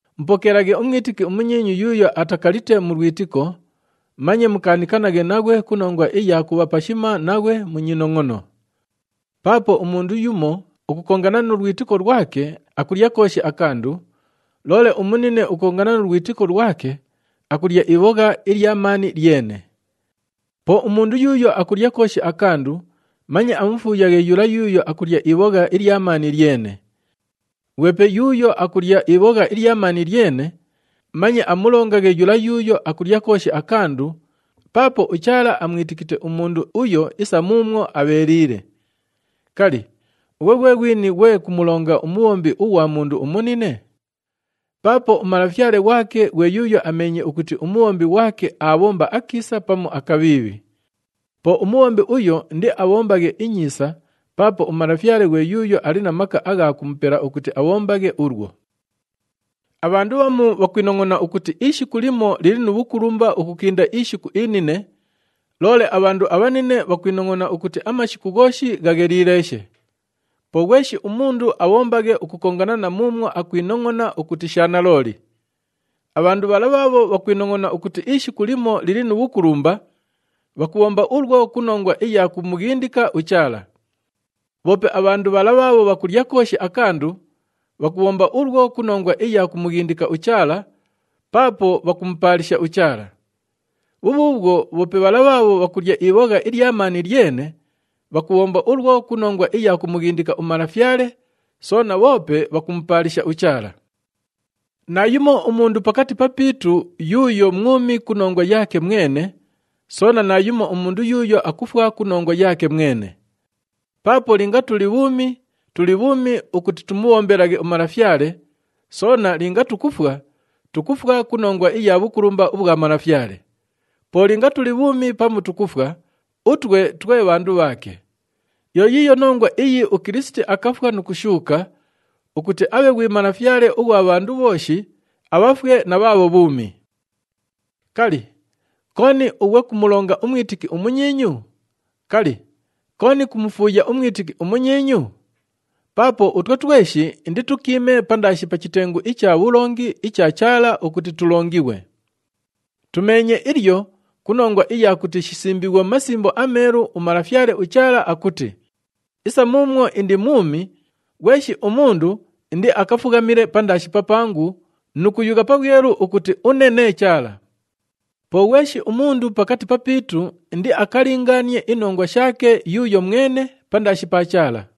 Mupokeelaghe umwitiki umunyiinyu yuuyo atakalite mu lwitiko, manye mukaanikanaghe naghwe ku nongwa iya kubha pashima naghwe mu nyinongʼono. Paapo umundu yumo ukukongana nu lwitiko lwake, akulya kooshi akandu, loole umunine ukukongana nu lwitiko lwake, akulya ibhogha ilya maani lyene. Po umundu yuuyo akulya kooshi akandu, manye amufuuyaghe yula yuuyo akulya ibhogha ilya maani lyene. Ghwepe yuuyo akulya ibhogha ilya maani lyene manye amulongaghe yula yuuyo akulya kooshi akandu, paapo uChaala amwitikite umundu uyo isa muumwo abheeliile. Kali, ughwe ghwe ghwini ghwe kumulonga umubhombi ughwa mundu umunine? Paapo umalafyale ghwake ghwe yuuyo ameenye ukuti umubhombi ghwake aabhomba akiisa pamu akabhiibhi. Po umubhombi uyo indiabhombaghe inyiisa paapo uMalafyale ghwe yuuyo ali na maka agha kumupela ukuti abhombaghe ulwo. Abhandu bhamu bhakwinongʼona ukuti ishiku limo lili nu bhukulumba ukukinda ishiku inine, loole abhandu abhanine bhakwinongʼona ukuti amashiku ghooshi ghagheliileeshe. Po ghweshi umundu abhombaghe ukukongana na muumwo akwinongʼona ukuti sha nalooli. Abhandu bhala bhaabho bhakwinongʼona ukuti ishiku limo lili nu bhukulumba, bhakubhomba ulwo ku nongwa iya kumughindika uChaala. Bhoope abhandu bhala bhaabho bhakulya kooshi akandu, bhakubhomba ulwo ku nongwa iya kumughindika uChaala, paapo bhakumupaalisha uChaala. Bhubhuubhwo bhoope bhala bhaabho bhakulya ibhogha ilya maani lyene, bhakubhomba ulwo ku nongwa iya kumughindika uMalafyale, soona bhoope bhakumupaalisha uChaala. Naayumo umundu pakati papiitu yuuyo mwumi ku nongwa yaake mwene, soona naayumo umundu yuuyo akufwa ku nongwa yaake mwene. Paapo linga tuli bhuumi, tuli bhuumi ukuti tumubhombelaghe uMalafyale, soona linga tukufwa, tukufwa ku nongwa iya bhukulumba ubhwa Malafyale. Po linga tuli bhuumi pamu tukufwa, utwe twe bhandu bhaake. Yo yiiyo nongwa iyi uKilisiti akafwa nu kushuuka ukuti abhe ghwi Malafyale ughwa bhandu bhooshi, abhafwe na bhaabho bhuumi. Kali, kooni ughwe kumulonga umwitiki umunyiinyu? Kali, kooni kumufuuya umwitiki umunyiinyu? Paapo utwe tweshi inditukiime pandaashi pa chitengu icha bhulongi icha Chaala ukuti tulongighwe. Tumeenye ilyo ku nongwa iya kuti shisimbiighwe mu Masimbo aMeelu, uMalafyale uChaala akuti, “Isa muumwo indi mwumi, ghweshi umundu indiakafughamile pandaashi papangu nu kuyugha pabhwelu ukuti une nee Chaala.” Po ghweshi umundu pakati papiitu indiakalingaanie inongwa shaake yuuyo mwene pandaashi pa Chaala.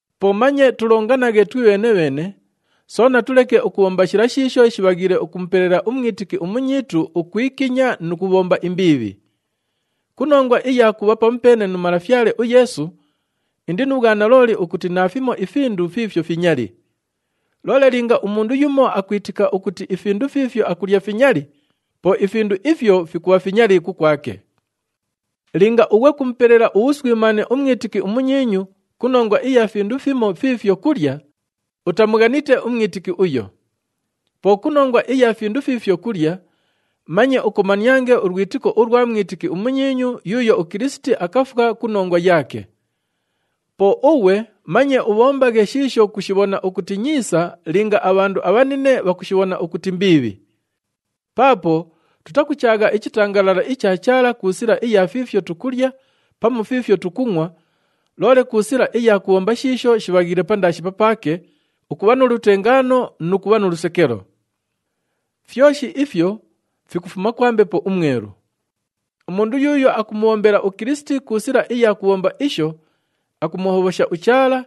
Po manye tulonganaghe twibheene-bheene, soona tuleke ukubhomba shila shiisho shibhaghiile ukumupelela umwitiki umunyiitu ukwikinya nu kubhomba imbiibhi. Ku nongwa iya kubha pamupeene nu Malafyale uYeesu, indi nu bhwanalooli ukuti naafimo ifindu fiifyo finyali. Loole linga umundu yumo akwitika ukuti ifindu fiifyo akulya finyali, po ifindu ifyo fikubha finyali kukwake. Linga ughwe kumupelela ubhuswimaane umwitiki umunyiinyu ku nongwa iya findu fimo fiifyo kulya, utamughanite umwitiki uyo. Po ku nongwa iya findu fiifyo kulya, manye ukomaniange ulwitiko ulwa mwitiki umunyiinyu yuuyo uKilisiti akafwa ku nongwa yaake. Po ughwe manye ubhombaghe shiisho kushibhona ukuti nyiisa linga abhandu abhanine bhakushibhona ukuti mbiibhi. Paapo tutakuchaagha ichitangalala icha Chaala ku sila iya fiifyo tukulya pamu fiifyo tukungʼwa, loole ku sila iya kubhomba shiisho shibhaghiile pandaashi papaake, ukubha nu lutengaano nu kubha nu lusekelo. Fyoshi ifyo fikufuma kwa Mbepo uMwelu. Umundu yuuyo akumubhombela uKilisiti ku sila iya kubhomba isho, akumuhobhosha uChaala,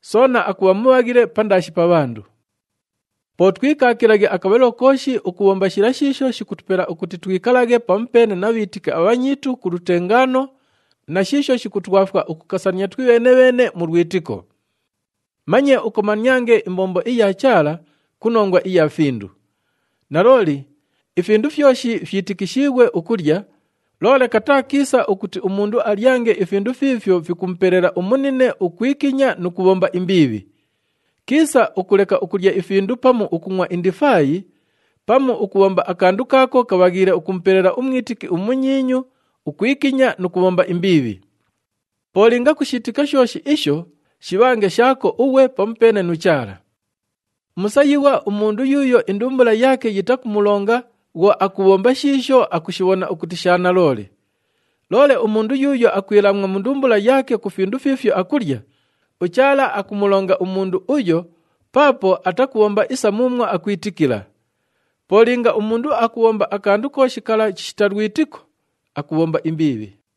soona akubha mubhaghile pandaashi pa bhandu. Po twikaakilaghe akabhalilo kooshi ukubhomba shila shiisho shikutupela ukuti twikalaghe pamupeene na bhiitiki abhanyiitu ku lutengaano, na shiisho shikutwafwa ukukasania twibheene-bheene mu lwitiko. Manye ukomaniange imbombo iya Chaala ku nongwa iya findu. Nalooli, ifindu fyoshi fyitikishiighwe ukulya, loole kataa kiisa ukuti umundu alyange ifindu fiifyo fikumupelela umunine ukwikinya nu kubhomba imbiibhi. Kiisa ukuleka ukulya ifindu pamu ukungʼwa indifaayi, pamu ukubhomba akandu kaako kabhaghiile ukumupelela umwitiki umunyiinyu ukwikinya nu kubhomba imbiibhi. Po linga kushiitika shooshi isho, shibhange shaako ughwe pamupeene nu Chaala. Musayighwa umundu yuuyo indumbula yaake yitakumulonga bhwo akubhomba shiisho akushibhona ukuti sha nalooli. Loole umundu yuuyo akwilaamwa mu ndumbula yaake ku findu fiifyo akulya, uChaala akumulonga umundu uyo paapo atakubhomba isa muumwo akwitikila. Po linga umundu akubhomba akandu kooshi kala chishita lwitiko, akubhomba imbiibhi.